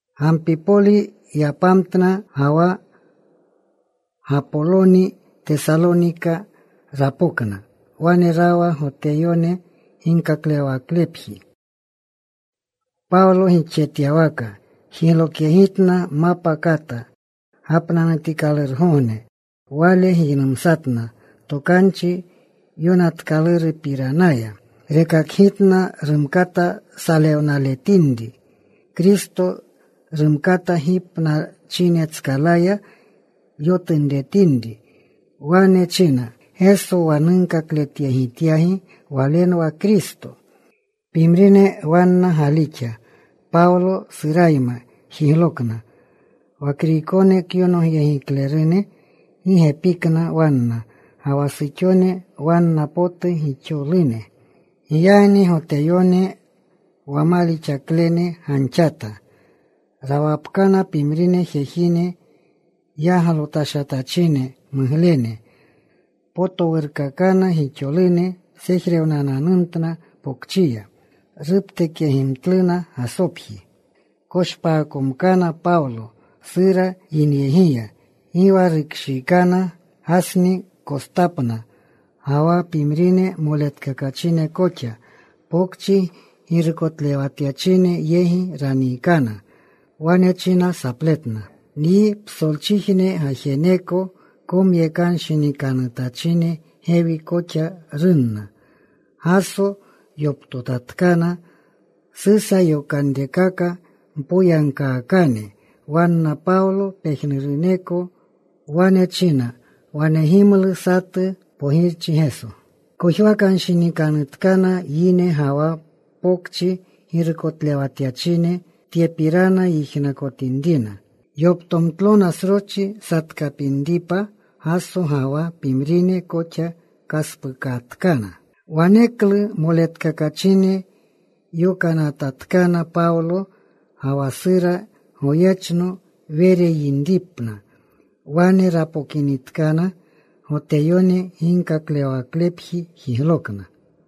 Gampipoli yapamtna, ga wa Gapoloni. Tesalonika rapokna. Wane rawa Goteyone ginkaklewawaklepji. Pawlo gixjetyawaka jiglokyegitna. Mapa kata gapnanutikalurgogne wale giynumsatna Tokanchi Yonatkalurupiranaya. Rekakgitna rumkata salewnaletinri Kristo. Rumkata gipnachinetskalaya yotunretinri. Wane china, “Geso wa nunkakletyegityagi Walenwa Kristo.” Pimrine wanna galixa. Pawlo, Surayma jiglokna. Wa Kriykone kyonogyegiklerune, gi gepikna wanna. Ga wa suxone wanna potu gixolune. Giyagni Goteyone wa malixaklene ganxata. Rawapkana pimrine jejine yaglotashatachine muglene. Potowurkaakana gixolune. Sejrewnananumtna pokchiya. Ruptekyegimtluna Gasopji. Koshpaakomkana Pawlo, Sura yinyegiya. Gi wa rukshiikana. Gasni kostapna, ga wa pimrine moletkakachine koxa. Pokchi girukotlewatachine yegi raniikana. Wane china sapletna, “Nyi psolchijne gajeneko komyekanshinikanutachine gewi koxa runna. Gaso yoptotatkana. Susa yokanrekaka mpoyagkaakane wanna Pawlo pejnuruneko. Wane chinna wanegimlu satu pogirchi Geso.” Kojwakanshinikanutkana yine ga wa pokchi girukotlewatyachine, tyepirana yijnakotinrina. Yoptomtlona sroschi satkapinripa Gaso ga wa pimrine koxa. Kaspuukatkana. Waneklu moletkakachine yokanatatkana Pawlo ga wa Sura goyechno, Were yinripna. Wane rapokinitkana, Goteyone ginkaklewawaklepji jiglokna.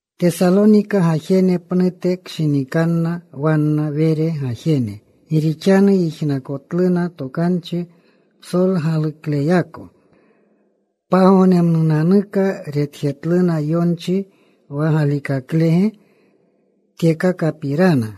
Tesalonika gajene pnute kshinikanna wanna Were gajene, gi rixanu yijnakotluna tokanchi psolgalukleyako. Pagognemnunanuka retjetluna yonchi wa galikaklege tyekakapirana.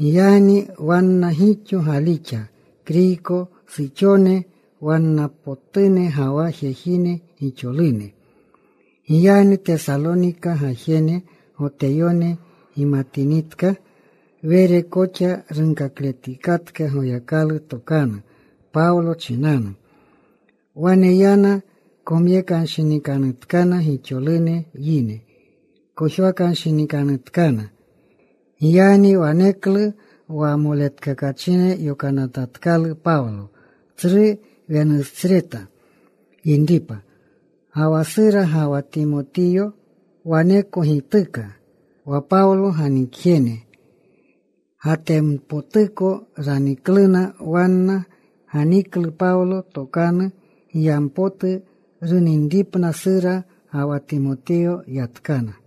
Giyagni wanna gixo galixa Kriyko suxone wanna potune, ga wa jejine gixolune. Giyagni Tesalonika gajene Goteyone gimatinitka Were koxa runkakletikatka Goyakalu tokanu Pawlo chinanu. Wane yana. Komyekanshinikanutkana gixolune yine. Kojwakanshinikanutkana. Giyagni waneklu wa moletkakachine yokanatatkalu Pawlo. Tsru wenusreta yinripa. Ga wa Sura ga wa Timotiyo waneko gituka. Wa Pawlo ganikjene Gatenpotuko ranikluna. Wanna ganiklu Pawlo tokanu giyampotu runinripna Sura ga wa Timotiyo. Yatkana.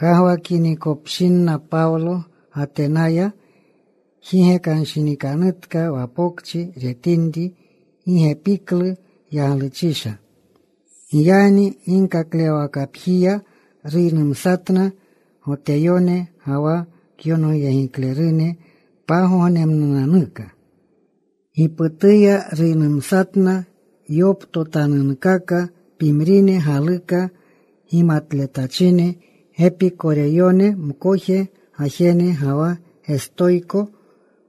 Kagwakinikopshinna Pawlo Gatenaya jigekanshinikanutka wa pokchi retinri gi gepiklu yagluchisha. Giyagni ginkaklewwakapjiya ruynumsatna Goteyone ga wa kyonogyegiklerune. Pagognemnunanuka giputuya ruynumsatna yoptotanunkaka. Pimrine galuka gimatletachine Gepikoreyone mkoje gajene ga wa Gestoyko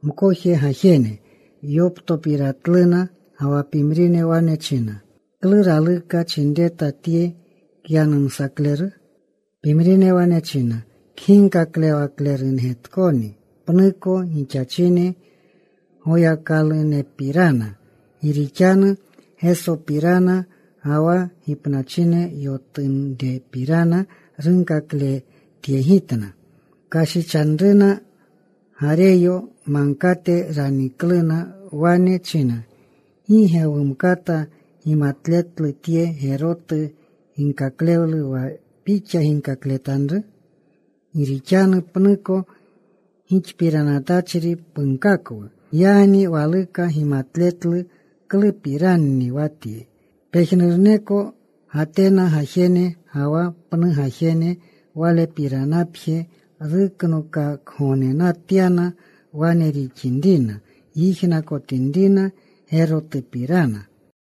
mkoje gajene yoptopiratluna. Ga wa pimrine wane china, “¿Klu raluka chinreta tye kyanumsakleru?” Pimrine wane china, “Kginkaklewaklergetkoni pnuko gixachine goyakalunepirana.” Gi rixanu Gesopirana ga wa gipnachine yotunrepirana runkakletyegitna. Kashichanruna. Gareyo Magkate ranikluna. Wane chinna, “¿Gi ge wumkata gimatletlu tye gerotu ginkaklewlu, wa pixa ginkakletanru? Gi rixanu pnuko gixpiranatachri punkakwu. Giyagni waluka gimatletlu klupiranni wa tye.” Pejnuruneko Gatena gajene ga wa pnu gajene, walepiranapje ruknokakgognetyana, wane rixinrina yijnakotinrina gerotupirana.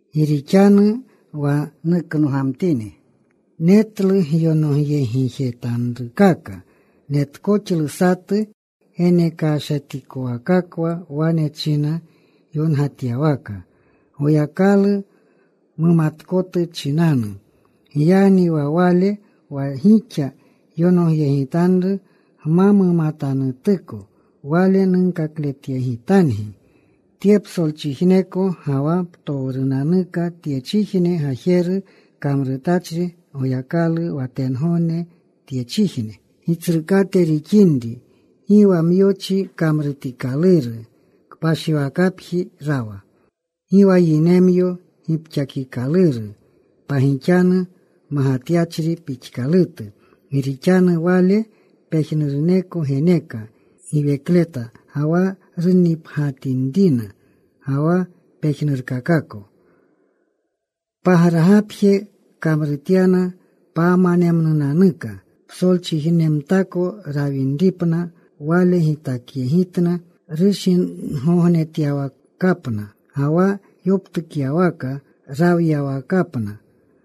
Gi rixanu wa nuknogamtini, netlu gyonogyegjetanrukaka. Netkoxlu satu genekashatikwakakwa, wane china yongatyawaka: Goyakalu Mumatkotu Chinanu. “Giyagni wa Wale wa gixa yonogyegitanru gma mumatanutuko, Wale nunkakletyegitangi. “Tye psolchijneko ga wa ptowrunanuka tyechijne gajeru kamrutachri Goyakalu, wa tengogne, tyechijne Gitsrukate rixinri, gi wa myochi kamrutikaluru kpashiwakapji rawa. Gi wa yinemyo gipxakikaluru pagixanu magatyachri pixkalutu. Gi rixanu Wale pejnuruneko geneka giwekleta, ga wa runnipgyatinrina, ga wa pejnurkakako. “Pagragapje kamrutyana panermnunanuka psolchijnemtako rawinripna. Wale gitakyegitna rushingognetyawakapna, ga wa yoptukyawaka rawyawakapna.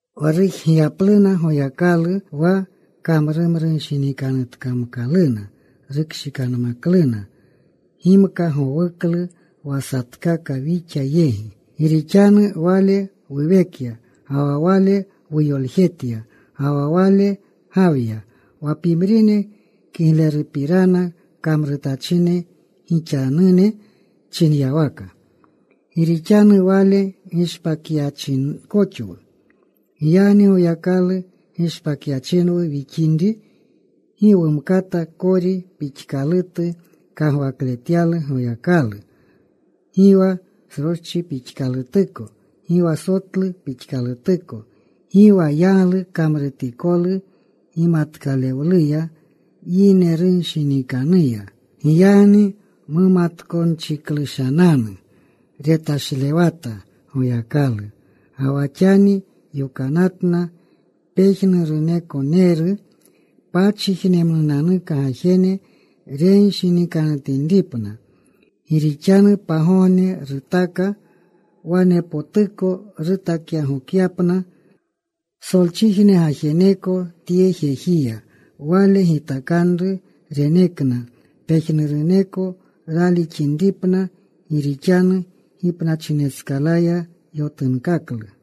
Wa rujgiyapluna Goyakalu, wa kamrumrunshinikanutkamkaluna rukshikanmakluna. Gimka gowuklu wa satkaka wixa yegi. Gi rixanu Wale wuwekya, ga wa Wale wuyoljetya, ga wa Wale gawya. Wa pimrine kiglerupirana kamrutachine gixanune chinyawaka: Gi rixanu Wale gishpakyachinkoxwu. “Giyagni Goyakalu gishpakyachinwu wixinri, gi wumkata kori pixkalutu kagwakletyalu Goyakalu, gi wa sroschi pixkalutuko, gi wa sotlu pixkalutuko, gi wa yaglu kamrutikolu gimatkalewluya, yinerushinikannuya. Giyagni mumatkonchiklushananu, retashlewata Goyakalu. Ga wa xani yokanatna pejnurunekoneru pachijnemnunanuka gajene renshinikanutinripna. Gi rixanu pagogne rutaka wanepotuko rutakyagokyapna psolchijne gajeneko tye jejiya Wale gitakanru. Renekna pejnuruneko ralixinripna gi rixanu gipnachinetskalaya yotunkaklu.”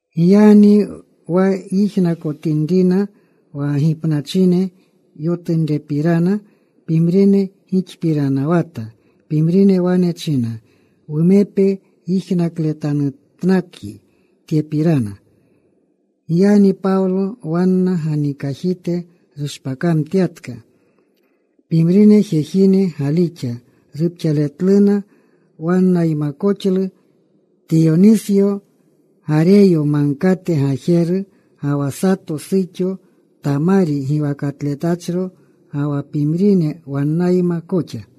Giyagni wa yijnakotinrina wa gipnachine yotunrepirana, pimrine gixpiranawata. Pimrine wane china, “Wumepe yijnakletanutnakyi tyepirana.” Giyagni Pawlo wanna ganikajite rushpakamtyatka. Pimrine jejine galixa. Rupxaletluna. Wannaymakoxlu Tiyonisyo, Gareyo Magkate gajeru, ga wa sato suxo Tamari giwakatletachro, ga wa pimrine wannayma koxa.